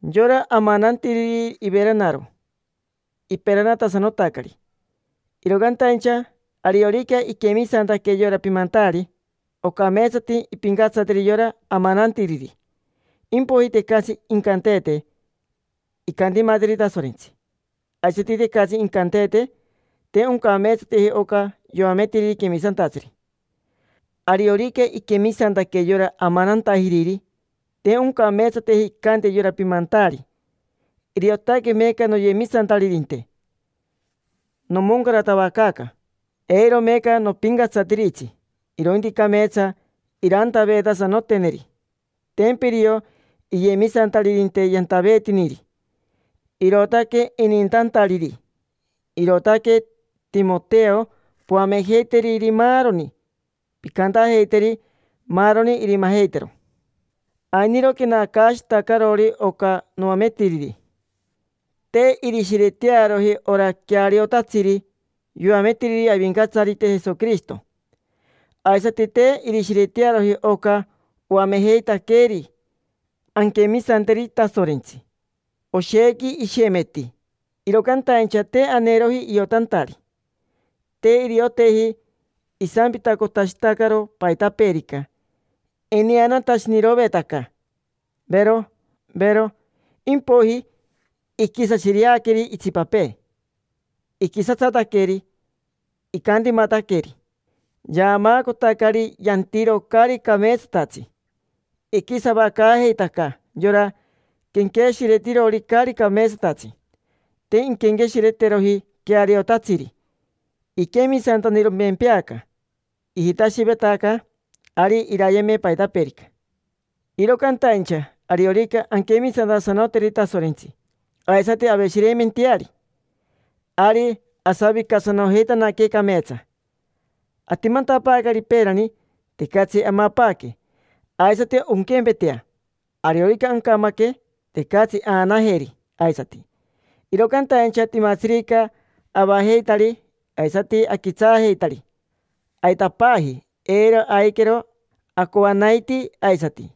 Yora amanantiriri iveranaro, iperanatasanotacari. Iro cantaincha ariorica iquemisantaque yora pimantaari, ocameetsati impincatsateri yora amanantiriri. Impoiji tecatsi incanteete incantimateri Tasorentsi, aisati tecatsi incanteete: “Te oncameetsateji oca yoametiriri quemisantatsiri”. Ariorica iquemisantaque yora amanantajiriri, te oncameetsateji incante yora pimantaari: “Iriotaque meeca noyemisantaririnte, nomoncaratavacaaca. Eiro meeca nopincatsatiritsi”. Irointi cameetsa irantaveetasanoteneri: tempa irio iyemisataririnte yantaveetiniri, irootaque inintantariri. Irootaque, Timoteo, poamejeiteriri maaroni, pincantajeiteri maaroni irimajeitero. Ainiro quenacaashitacarori oca noametiriri. Te irishiretearoji ora queariotatsiri yoametiriri Avincatsarite Jesoquirishito. Aisati te irishiretearoji oca oamejeitaqueeri anquemisanteri Tasorentsi. Oshequi ishemeti, iro cantaincha te aneeroji iotantari. Te irioteji. Isampitacotashitacaro paitapeerica. Ineanatashiniroveetaca, vero, vero. Impoiji iquisashireaqueri itsipapee, iquisatsataqueri, icantimataqueri, yaamaacotacari yantiro caari cameetsatatsi. Iquisavacaajeitaca yora quenqueshiretirori caari cameetsatatsi, te inquenqueshireteroji queariotatsiri. Iquemisantaniromempeaca, ijitashivetaca ari irayeme paitapeerica. Iro cantaincha ariorica anquemisantasanoteri Tasorentsi, aisati aveshireimenteari, ari asavicasanojeitanaque cameetsa. Atimantapaacari peerani, tecatsi amapaaque. Aisati onquempetea, ariorica ancamaque, tecatsi aanajeri aisati. Iro cantaincha timatsirica avajeitari aisati aquitsaajeitari, aitapaaji, eiro aiquero acoanaitii aisati.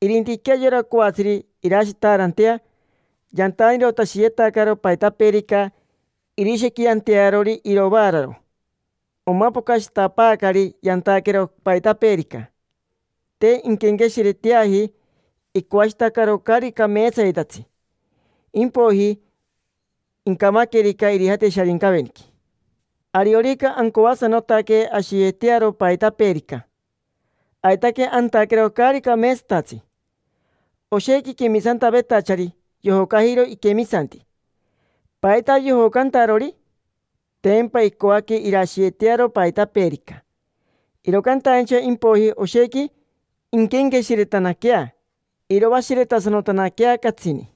Irintiquea yora coatsiri irashitaarantea yantanirotashiyetacaro paitapeerica irishequiantearori irovaararo. Omapocashitapaacari yantaquero paitapeerica. Te inquenqueshireteaji, icoashitacaro caari cameetsayetatsi, impoiji incamaquerica, irijate Sharincaveniqui. Ariorica ancoasanotaque ashiyetearo paitapeerica, aitaque antaquero caari cameetsatatsi. Oshequi quemisantavetachari yojocajiro iquemisanti. ¿Paita yojocantarori? Tempa icoaque irashiyetearo paitapeerica, iro cantaincha impoiji oshequi inquenqueshiretanaquea, iroashiretasanotanaquea catsini.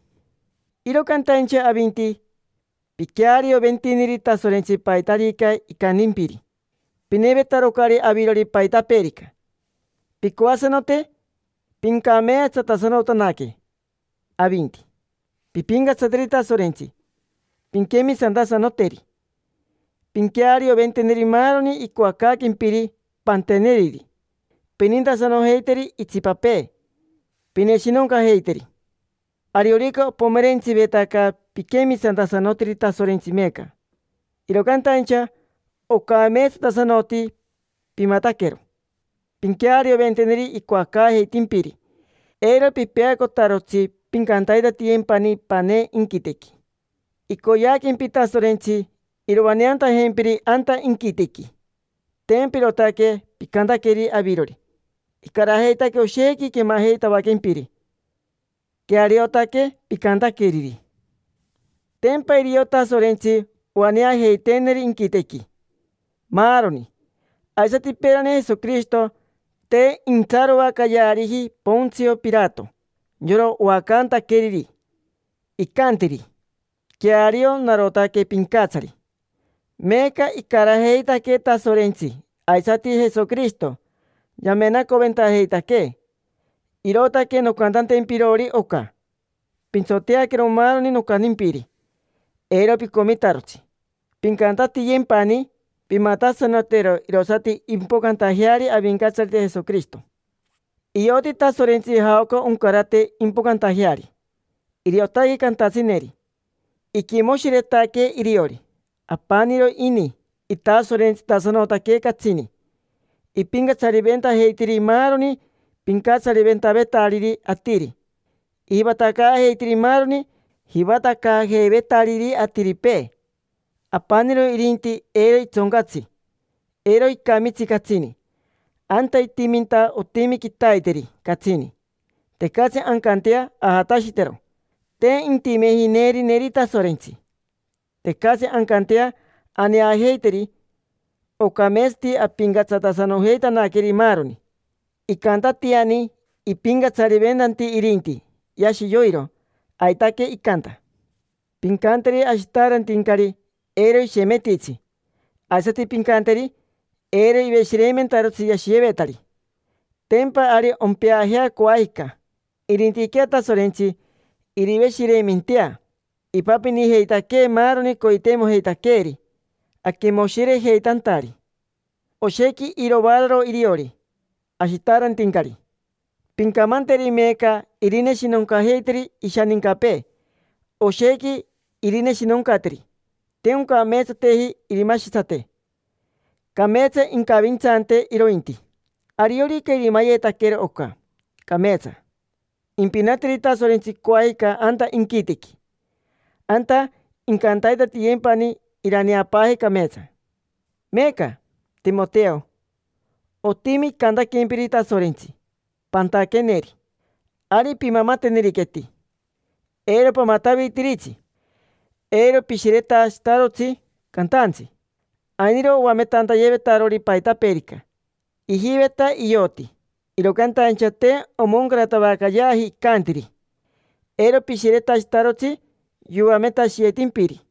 Iro cantaincha avinti, piquearioventiniri Tasorentsi paitarica icantimpiri. Pinevetarocari avirori paitapeerica. Pincoasanote pincameetsatasanotanaque avinti. Pimpincatsateri Tasorentsi, pinquemisantasanoteri, pinquearioventeneri maaroni icoacaaquempiri, pantaveeteneri; pinintasanojeiteri itsipapee, pineshinoncajeiteri. Ariorica opomerentsivetaca piquemisantasanotiri Tasorentsi meeca, iro cantaincha ocameetsatasanoti pimataquero. Pinquearioventeneri icoacaajeitimpiri. Eiro pipeacotarotsi: pincantaitatiyempani panee inquitequi. Icoyeaquempi Tasorentsi iroaneantajempiri anta inquitequi. Tempa irootaque picantaqueri avirori, icarajeitaque oshequi quemajeitavaquempiri. Queariotaque picantaqueriri. Tempa irio Tasorentsi oaneajeiteeneri inquitequi, maaroni. Aisati peerani Jesoquirishito, te intsaroacayeariji Pontsio Pirato, yora oacantaqueriri. Icantiri: “Queario, narotaque pincatsari”. Meeca icarajeitaquee Tasorentsi aisati Jesoquirishito, yamenacoventajeitaquee. Irootaque noncantantempirori oca: pintsoteaquero maaroni nocantimpiri, eiro picomitarotsi. Pincantatiyempani, pimatasanotero irosati impocantajeari Avincatsarite Jesoquirishito. Ioti Tasorentsi jaoca oncarate impocantajeari, iriotaque cantatsineri. Iquimoshiretaque iriori. Apaniro ini, itasorentsitasanotaque catsini, ipincatsariventajeitiri maaroni pincatsariventavetariri atiri, ijivatacaajeitiri maaroni jivatacaajeivetariri atiripee. Apaniro irinti eiro itsoncatsi, eiro icamitsi catsini. Anta itiminta otimi quitaiteri catsini, tecatsi ancantea ajatashitero. Te intimeji neerineri Tasorentsi. Tecatsi ancantea aneajeiteri. Ocameetsati ampincatsatasanojeitanaqueri maaroni. Icantatiani ipincatsariventanti irinti, yashi yoiro. Aitaque icanta. Pincanteri ashitaarantincari eiro ishemetitsi. Aisati pincanteri eiro iveshireimentarotsi yashiyevetari, tempa ari ompeajea, coajica. Irintiquea Tasorentsi iriveshireimentea. Ipapinijeitaquee maaroni coiteimojeitaqueeri aquimoshirejeitantari. Oshequi iroaararo iriori ashitaarantincari. Pincamanteri meeca irineshinoncajeiteri ishanincapee, oshequi irineshinoncateri. Te oncameetsateji irimashitsate. Cameetsa incavintsante, irointi. Ariorica irimayetaquero oca, cameetsa. Impinateri Tasorentsi coajica anta inquitequi, anta incantaitatiyempani iraneapaaje cameetsa. Meeca, Timoteo, otimi icantaquempiri Tasorentsi pantaqueneri. Ari pimamateneriqueti, eiro pamatavitiritsi. Eiro pishiretashitarotsi cantaantsi. Ainiro oametantayevetarori paitapeerica, ijiveta ioti, iro cantaincha te omoncaratavacayeaji icantiri. Eiro pishiretashitarotsi yoametashiyevetimpiri.